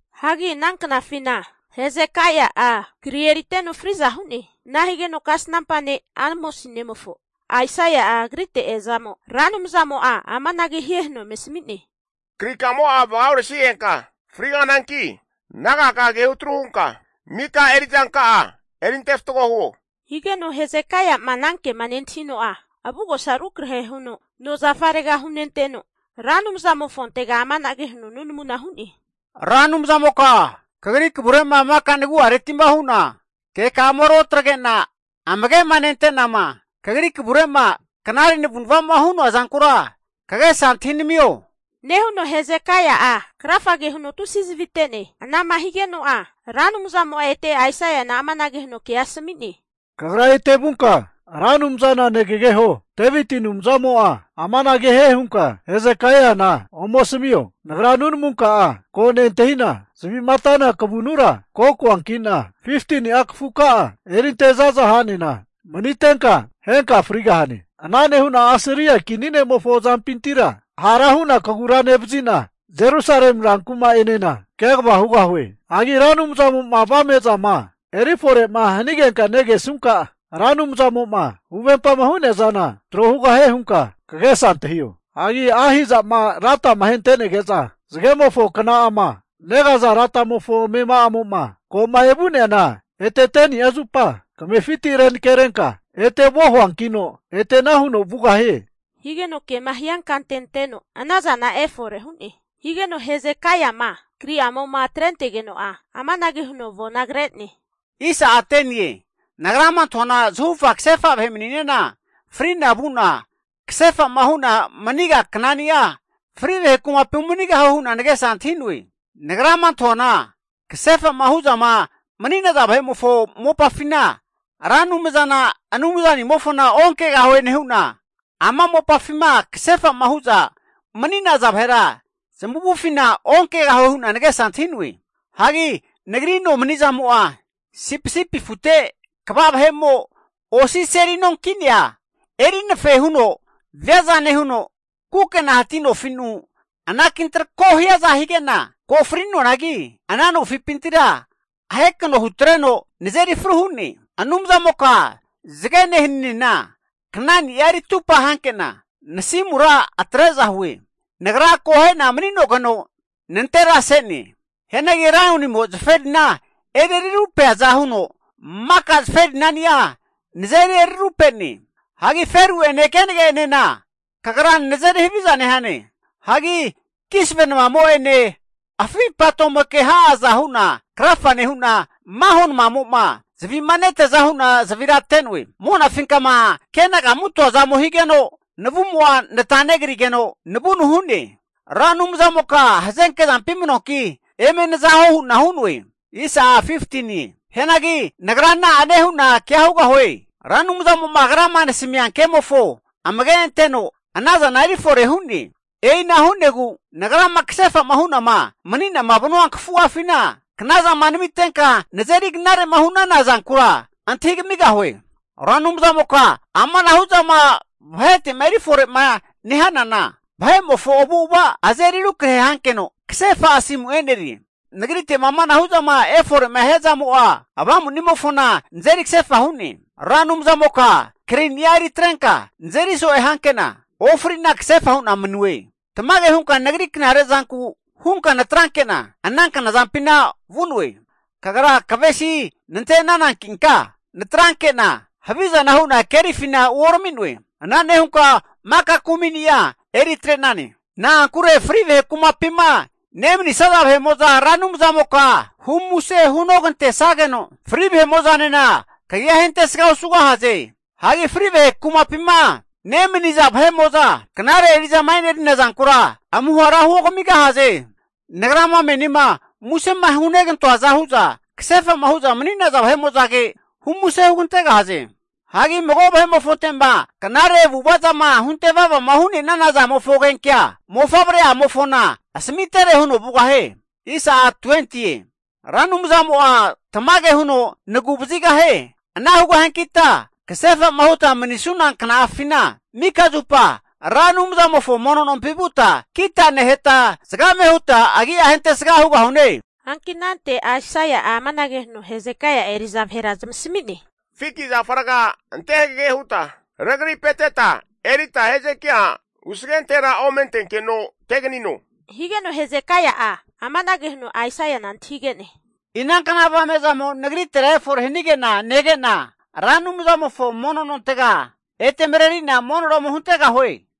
Hagi ana knafina Hesekaia'a kri eriteno fri'za hu'ne. Ana higeno kasnampa ne' Amosi nemofo Aisaia'a agrite eazamo, Ra Anumzamo'a amanage hie huno eme asami'ne, Krikamo'a vaga oresnigenka frigahananki, nagaka'a kehu atru hunka mika eri'zanka'a erinte fatgo huo. Higeno Hezekaia'ma anankema nentahino'a, avugosa rukrahe huno nozafarega hunenteno, Ra Anumzamofontega amanage hu'ne, nunamuna hu'ne, Ra Anumzamoka kagri kavure'ma maka nagu'areti'ma hu'na keka'ama ruotagre'na amage'ma nente'nama, kagri kavure'ma knare navu'nava'ma hu'noa zankura kagesa antahi namio, nehuno Hezekaia'a krafage huno tusi zavi ate'ne. Anama higeno'a, Ra Anumzamo'a ete Aisaiana amanage huno kea asami'ne, Kagra ete vunka, Ra Anumzana negageho Deviti Anumzamo'a amanage hie hunka Hezekaiana ome asamio, Nagra nunamunka'a ko nentahi'na zavi'ma atana kavunura ko koanki'na, 15ni'a kafuka'a erinte zaza ha'nena manitenka henka frigahane. Ana nehu'na Asiria kini ne'mofo azampintira hara hu'na kagura nevazi'na, Jerusalemi rankuma'enena kegava hugahue. Hagi Ra Anumzamo'ma avame'zama eri fore'ma hanigenkama negesunka, Ra Anumzamo'ma huvempama hu'nea zana tro hugahie hunka kagesa antahio. Hagi Ahasi'ma latama ahentenege'za zagemofo kna'ama negaza latamofo amema'amo'ma ko'ma evu'neana ete 10ni'a zupa kamefiti renakerenka ete vuo huankino, ana huno ete vugahie, higeno kema hiankante anteno anazana efore hu'ne. Higeno Hezekaiama kri'amo'ma atrentegeno'a amanage huno avona kre'ne, Nagrama antahuana zahufa kasefa vahe mani'nena fri'na vu'na kasefa'ma hu'na maniga knani'a, fri vahe kumapi umanigahue hu'na nagesa antahi'noe. Nagrama antahuana kasefa'ma huzama mani'naza vahe'mofo mopafina Ra Anumzana Anumzanimofona onkegahue nehu'na, ama mopafima kasefa'ma hu'za mani'naza vahera zamavufina onkegahue hu'na nagesa antahi'noe. Hagi nagri nomanizamo'a sipisipi afute kva vahe'mo osi seli no ki'nea eri anafe huno viaza nehuno, kukena hati nofi'nu anaki antrako hiaza hige'na ko fri'noanagi ana nofipintira ahekano hutreno nazeri fru hu'ne. Anumzamoka zagene haninena knani'a eri atupa hanke'na nasimura atre'za hue. Nagra akohe'na mani'nogeno nantera se'ne. Hianagi laionimo zaferina eri rarupeaza huno maka zaferinani'a nazeri rarupe'ne. Hagi feru'ene kenage'enena kagra nazeri haviza nehane. Hagi kisave namamo'ene afi patomoke ha'aza hu'na krafa nehu'na, maho namamo'ma zavi'ma neteaza hu'na zavira ate'noe. Monafinkama kenagamutoa zamo higeno navumo'a nata negrigeno navunu hu'ne. Ra Anumzamoka hazenke zampi manuanki eme naza huo hu'na hu'noe! Hianagi nagra na'ane hu'na kea hugahue? Ra Anumzamo'ma agrama nasami'nea kemofo amage anteno ana zana eri fore hu'ne. E'ina hu'negu nagrama kasefa'ma hu'nama mani'nama vanua kafu'afina, knazama namitenka nazeri knare'ma hu'nana zankura antahi kamigahue. Ra Anumzamoka amanahu' zama vahete'ma eri fore'ma nehanana, vahe'mofo avu'ava azeri rukrahe hankeno kasefa asimu e'nerie. Nagrite'ma amanahu' zama efore'ma hia zamo'a avamunimofona nazeri kasefa hu'ne. Ra Anumzamoka krini'a eri atrenka, nazeri so'e hanke'na ofri'na kasefa hu'na manue. Tamage hunka nagri knare zanku hunka natrankena ana knazampina vu'noe. Ra Anumzamoka kagra kavesi nante'nanankinka natranke'na havizana hu'na kerifina uorami'noe. Ana nehunka maka kuminia eri atre'nane. Na'ankure fri vahe kumapima nemanisaza vahe'mo'za Ra Anumzamoka hu muse hunogantesageno, fri vahe'mo'zanena kagia ahentesga osugahaze. Hagi fri vahe kumapima nemani'naza vahe'mo'za knare eri'zama enerina zankura amuhara huogamigahaze. Nagrama menima musema hunegantoaza hu'za kasefa'ma hu'za mani'naza vahe'mo'zage humusea hugantegahaze. Hagi mago ne'mofonte'ma knare avu'ava zama hunte vava hu'nenana zamofo agenkea, mofavre'amofona asamitere huno vugahie. Ra Anumzamo'a tamage huno nagu vazigahie. Ana hugahiankita kasefa'ma huta manisuna kna'afina maka zupa Ra Anumzamofo mono nompi vuta zavena neheta, zagame huta agia ahentesga hugahune. Hanki anante Aisaia'a amanage huno Hezekaia eri'za vahera zamasami'ne, fiki zafa raga ante hagege huta regripeteta erita Hezekaia usagentera ome antenkeno teganino. Higeno Hezekaia amanage huno Aisaiana antahige'ne. Inankna avame'zamo nagritera efore hanige'na nege'na, Ra Anumzamofo mono nontega ete mareri'na monora ome huntegahue?